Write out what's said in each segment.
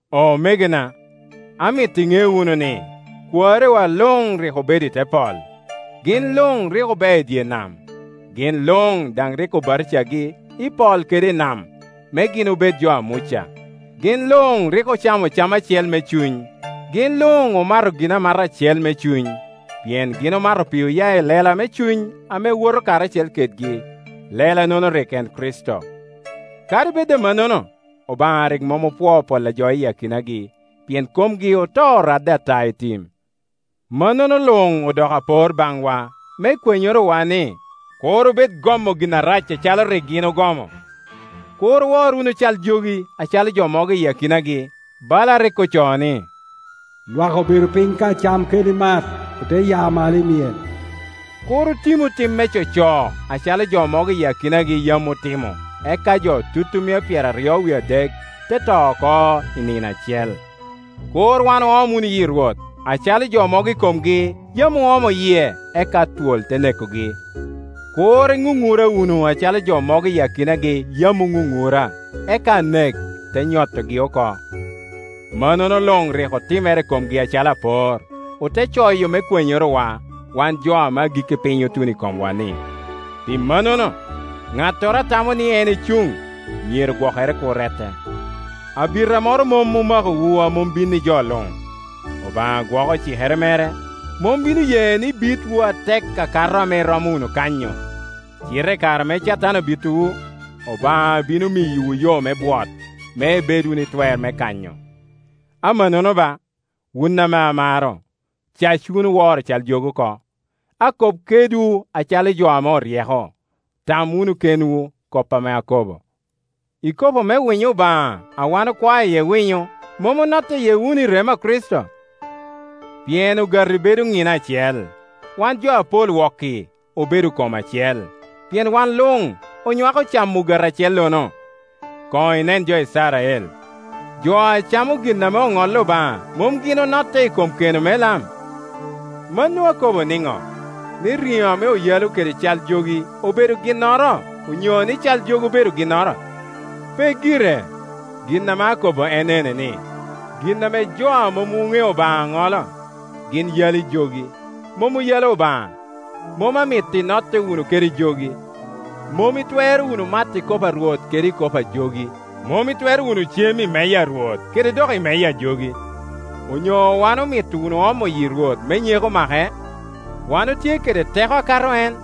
Omegona, amito iŋe wunu ni, kwariwa luŋ rik obedo i te pol, gin luŋ rik obeo i dye nam, gin luŋ daŋ rik obatija-yi i pol kede i nam, me gin obedjo a Muca. Gin luŋ rik ocamo cam acel me cuny, gin luŋ omato ginamata acel me cuny. Pien gin omato pe oya I lela me cuny ame woto karacel kedgi, lela-nono rik en Kricito. Kadi bed amannono, Obaŋa rik mom opwoo pol a jo i akinagi; pien komgi oto oradde ata i tim. Mannono luŋ odoko apor baŋwa, me kwenyorowa ni kur obed gomo gin arac acalo rik gin ogomo. Kur owor wunu cal jogi acalo jo mogo i akinagi; bala a rik ocoo ni, “Lwak obedo piny ka cem kede mat, ote ya malo i myel.” Kur oumu um me coco, acalo jo mogo I akinagi yam otimo, eka jo tutumia pyeraryo wie adek te to oko i nino acel. Kur wan oom wunu yi Rwot, acalo jo mogo i komgi yam oomo yie, eka twol te nekogi. Kur inunura wunu acalo jo mogo i akinagi yam Oŋuŋura, eka Anek te nyotogi oko. Mannono luŋ rik otimere i komgi acalo apor, ote coyo me kwenyorowa, wan jo ame agikki piny otuno i komwa-ni. Pi mannono, ŋattoro a tamo ni en ecuŋ myero gwokere kur rette. Abita moro mom omakowu a mom binni jo luŋ; Obaŋa gwoko cikere mere, mom bino ye ni bitwu atek akato ame iromo wunu kanyo, cite i kare ame Catan abitowu, Obaŋa bino miyowu yo me bwot, me ibed wunu i twer me kanyo. Amannono ba, wun ame amaro cac wunu woro cal jogi oko. Akop kedwu acalo jo ame oryeko; tam wunu kedwu kop ame akobo. Ikopo me winyo Obaŋa, a wan okwao iye winyo, mom onotte iye wunu i remo a Kricito? Pien ogati bedo nina acel, wan jo apol wok-ki obedo kom acel, pien wan luŋ onywako camo ogati acellono. Koŋ inen jo Icrael; jo a camo gin ame oŋolli Obaŋa mom gin onotte i kom keno me lam? Mano akobo niŋo? Ni nijo ame oyalo kede cal jogi obedo gmnoro onyo ni cal jogi obedo ginnoro? Pe gire. Gin ame akobo en ene ni gin ame jo a mom oŋeo Obaŋa ŋolo, gin yalo i jogi, mom oyalo Obaŋa. Mom amito inotte wunu kede jogi. Mom itwero wunu mato ikopo a Rwot kede ik opo a jogi. Mom itwero wunu cem i meja a Rwot kede dok i meja a jogi. Onyo wan omito wunu omo yi Rwot me nyeko make? Wan otye kede teko akato en?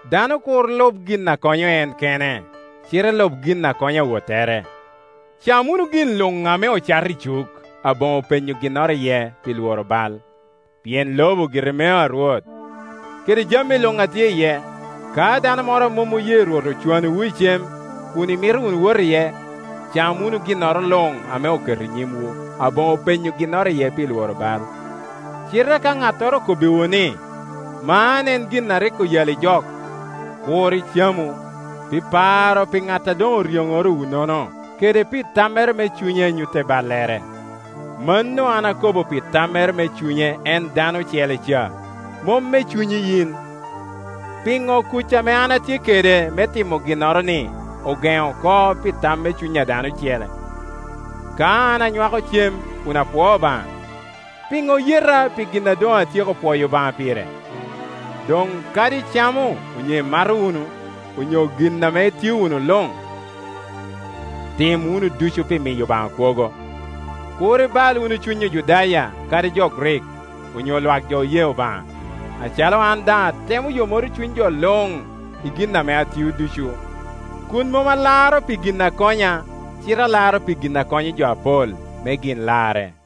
Dano kur lub gin a konyo en kene, cite lub gin a konyo awottere. Cam wunu gin luŋ ame ocato i cuk aboŋo penyo ginnoro iye pi lworo bal: Pien lobo gire mea Rwot, kede jami luŋ a tye iye. Ka dano moro a mom oye Rwot ocwanowu i cem, kun imito wunu wot iye, cam wunu ginnoro luŋ ame oketo i nyimwu, aboŋo penyo ginnoro iye pi lworo bal. Cite ka ŋattoro okobbiwu ni, “Man en gin a rik oyalli jok,” kur icamu, pi paro pi ŋat a doŋ oryonorowu-nono, kede pi tammere me cunye a nyutte ballere. Mano an akobo pi tammere me cunye en dano ocele ca, mom me cunyi yin. Piŋo kuc ame an atye kede me timo ginnoro-ni ogeŋo oko pi tam me cuny dano ocele? Ka an anywako cem kun apwoo Obaŋa, piŋo oyeta pi gin a doŋ atyeko pwoyo Obaŋa pire? Doŋ kadi icamo onyo imato wunu onyo gin ame itio wunu luŋ, tim wunu ducu pi miyo Obaŋa kwogo. Kur ibal wunu cuny Ojudaya, kadi jo Grik, onyo lwak jo oye Obaŋa, acalo an daŋ atemo yomoro cuny jo luŋ i gin ame aŋeo ducu, kun mom alaro pi gin a konya, cite alaro pi gin a konyo jo apol, me gin larre.